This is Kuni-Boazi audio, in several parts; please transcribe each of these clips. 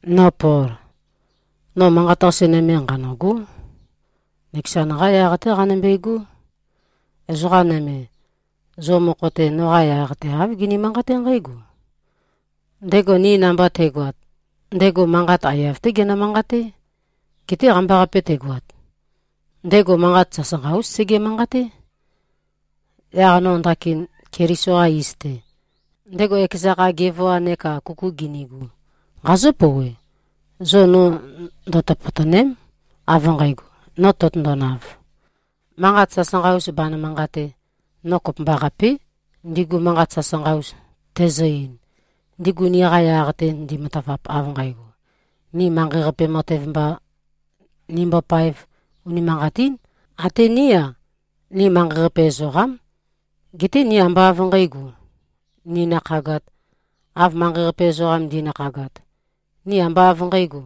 No Pol, no manqat-qase nøme nqanø̂gó. Nøkezan-qa yaq-té qanømbegó. Ezoqa nøme, zo mokho-te, noqa yaq-te āv gini-manqaté nqǽgo, “Ndego ni namba te꞉goat, ndego manqat aiyav-té genø-manqaté. Geté qambaqape tegoat, ndego manqat sasanqa-ús sege-manqaté.” Yaq no ndakin, Keliso-qa iz-te, ndego ekeza kha gevoa neka kuku ginigu, nqazǿ-pouwe: Zo no ndøtøpøtø̀ne᷄m, av nqægo, no tøtøndonav, manqat sasanqa-us banø-manqatē. No kopømbaqapé, ndigu manqat sasanqa-us tæzø-ein, ndigu niqa yaq-te ndimatavap av nqægo, ni manqei-qape matev mba nimbopāev. Unimanqatín. Até ní-a, ni manqei-qape ezoqám. Geté ni ambá av nqǣgo, ninakhagāt, av manqei-qape ezoqam ndi꞉nakhagat. Ni ambá av nqǣgo,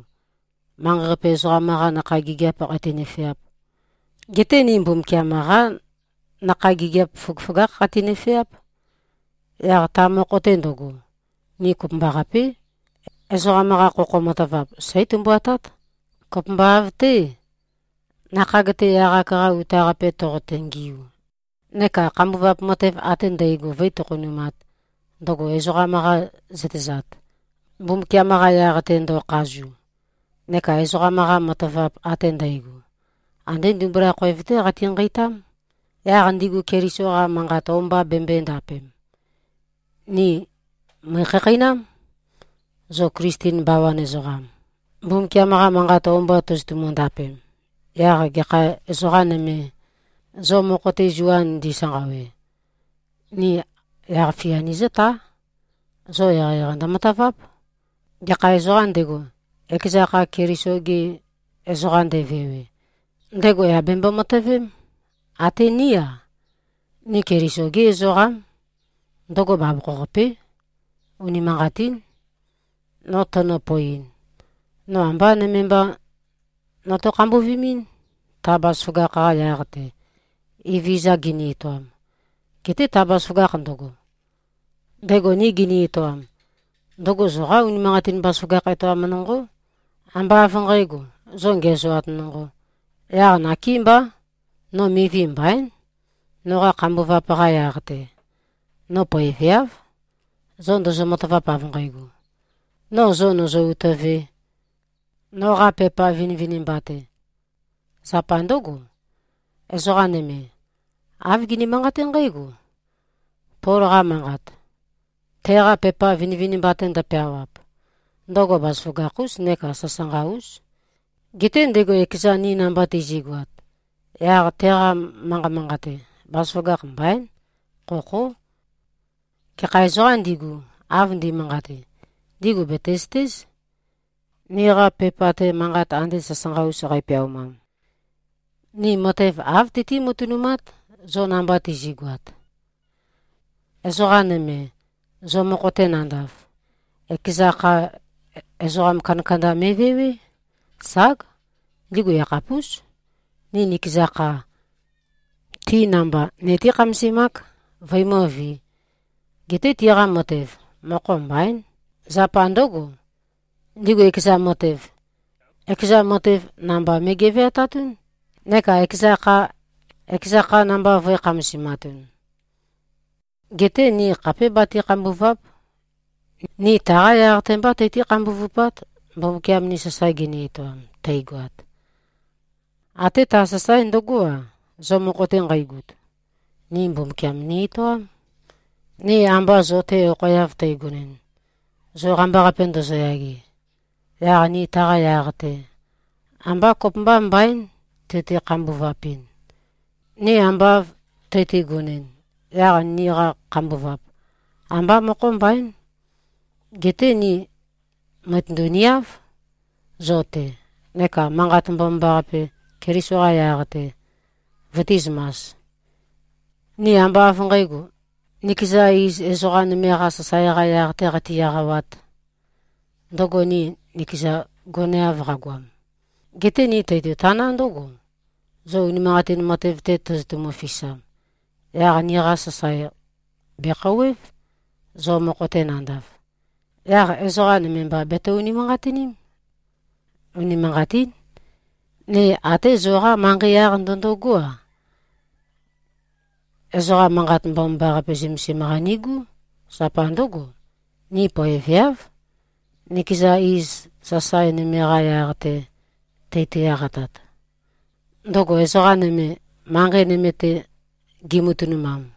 manqei-qape ezoqam-qā nakhag gigiāp qati-nøfeāp. Geté ni Mbumbukiam-qá nakhag gigiap føgøføgákh qati-nøfeáp. Yaq ta mokho-te ndøgo, ni kopømbaqapé, ezoqam-qa khokho matavap seí-tømbuatát, kopømba av-té, nakhag-te yaq-ak-qa uta-qape toqote-ngiu, neka khambuvap matev ate ndægo vǿi-tokhonumāt, ndøgo ezoqam-qa zøtezat, Mbumbukiam-qa yaq-te, ndo꞉khazu. Neka ezoqam-qa matavap ate ndægo, andé ndimbula khoev-té qati-nqeitám, yaq ndigu Keliso-qa manqat o-mba bembøē-ndapem. Ni mø̀ikhakheinám. Zo Klisten bawan ezoqam, Mbumbukiam-qa Manqat o-mba tozotumu-ndapem, yaq gekha ezoqā nøme, zo mokho-te zua ndisanqawe, ni yaq-fia nizǿtá. Zo eqeieqei ndømataváp. Gekha ezoqām ndego, ekeza kha Keliso-ge ezoqam nde꞉vewe, ndego yà bembo-matøvém, até ní-a, ni Keliso-gí ezoqám. Ndøgo bavokho-qapé. Unimanqatín. No tønø-poeɨn, no ambá nøme mba noto-khambuvimɨ́n, ta bazaføgakh-qa yaq-te, Evezøza gini-etoam. Geté ta bazaføgakh ndøgo, ndego ni gini-etoam, ndøgo zoqá unimanqatin bazaføgakh etoam nonqó, ambá av nqǣgo, zo ngiæzoat nonqō. Yaq nakémbá, no mivi mbaín, noqa khambuvap-qa yaq-te. No poeveáv, zo ndozo-matavap av nqægo, no zo nø̀zø-utøvē, noqa pepa vinivinimba-te. Zapa ndǿgo, ezoqa nøme, āv gini-manqaté nqǽgo, “Pol-qa manqat, teqa pepa vinivinimba-te ndøpeawap, ndøgo bazaføgakh-ús neka sasanqa-ús. Geté ndego ekezan ni namba tizi꞉goat, yaq teqa manqa manqate, bazaføgakh mbaín. Khokhó.” Gekha ezoqām ndigu, av ndi꞉manqate, ndigu bètezøtéz, niqa pepa-te manqat ande sasanqa-us qeipeaumam, ni matev āv tøtí-matønumát, zo namba tizi꞉goat. Ezoqa nøme, zo mokho-te nandav, ekeza kha ezoqa kandakanda me꞉vewé. Ság! Ndigu yakhapús. Ni nikeza kha, ti namba nití-khamasemák, vøimǿvī. Geté tiqa matev, mokho mbaín. Zapa ndǿgo, ndigu ekeza matev, ekeza matev namba me꞉geveatatún neka ekeza kha, ekeza kha namba vø̄e-khamasimatun. Geté ni khapé bati-khambùva᷄p. Ni taqá yaq-te mbá tøtí-khambuvupát, Mbumbukiam ni sasae gini-etoam, teigoat. Até ta sasae ndøgó-a, zo mokho-te nqeigut, ni Mbumbukiam ni-etoám. Ni amba zo-te okhoeav teigonɨn, zo qambaqape ndozoyage, yaq ni taqa yaq-te ambá kopømba mbaín tøti-khambuvapɨn. Ni amba av tøtigonɨn, yaq niqa khambuvap, ambá mokho mbaín. Geté ni mø̀itøndu-niáv zo-te, neka Manqat Mbomambaqape, Keliso-qa yaq-te, vøtīzømas. Ni ambá av nqǣgo, nikeza iz ezoqa nøme-qā sasae-qa yaq-tē qati-eqawāt, ndøgo ni nikezan goneav qagoam. Geté ni teitotaná ndǿgo: Zo unimanqatin matev-te tozotumu-fisam, yaq niqa sasae bèkhouwév, zo mokho-te nandav. Yaq ezoqa nøme mba beto-unimanqatiním. Unimanqatín. Ni até zoqá manqei yaq ndøndogó-a, ezoqa Manqat Mbomambaqape zømesim-qa nigú. Zapa ndǿgo, ni poeveáv, nikeza iz sasae nøme-qa yaq-te tøti-eqatat, ndøgo ezoqa nøme, manqei nøme-te gimatønumam.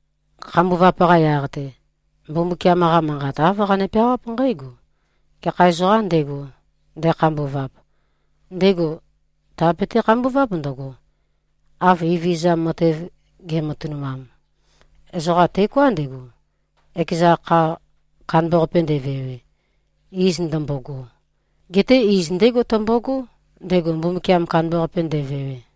Khambuvap-qa yaq-te, Mbumbukiam-qa Manqat āv qane-peawáp nqǽgo, “Gekha ezoqām ndego, ndekhambuvap, ndego tèabete-khambuváp ndøgo, av Evezøza matev ge꞉matønumam.” Ezoqam teoká ndego, ekeza kha kandambaqape ndevewe, iz ndømbogo. Geté iz ndégo tømbogó, ndego Mbumbukiam kandambaqape ndevewe.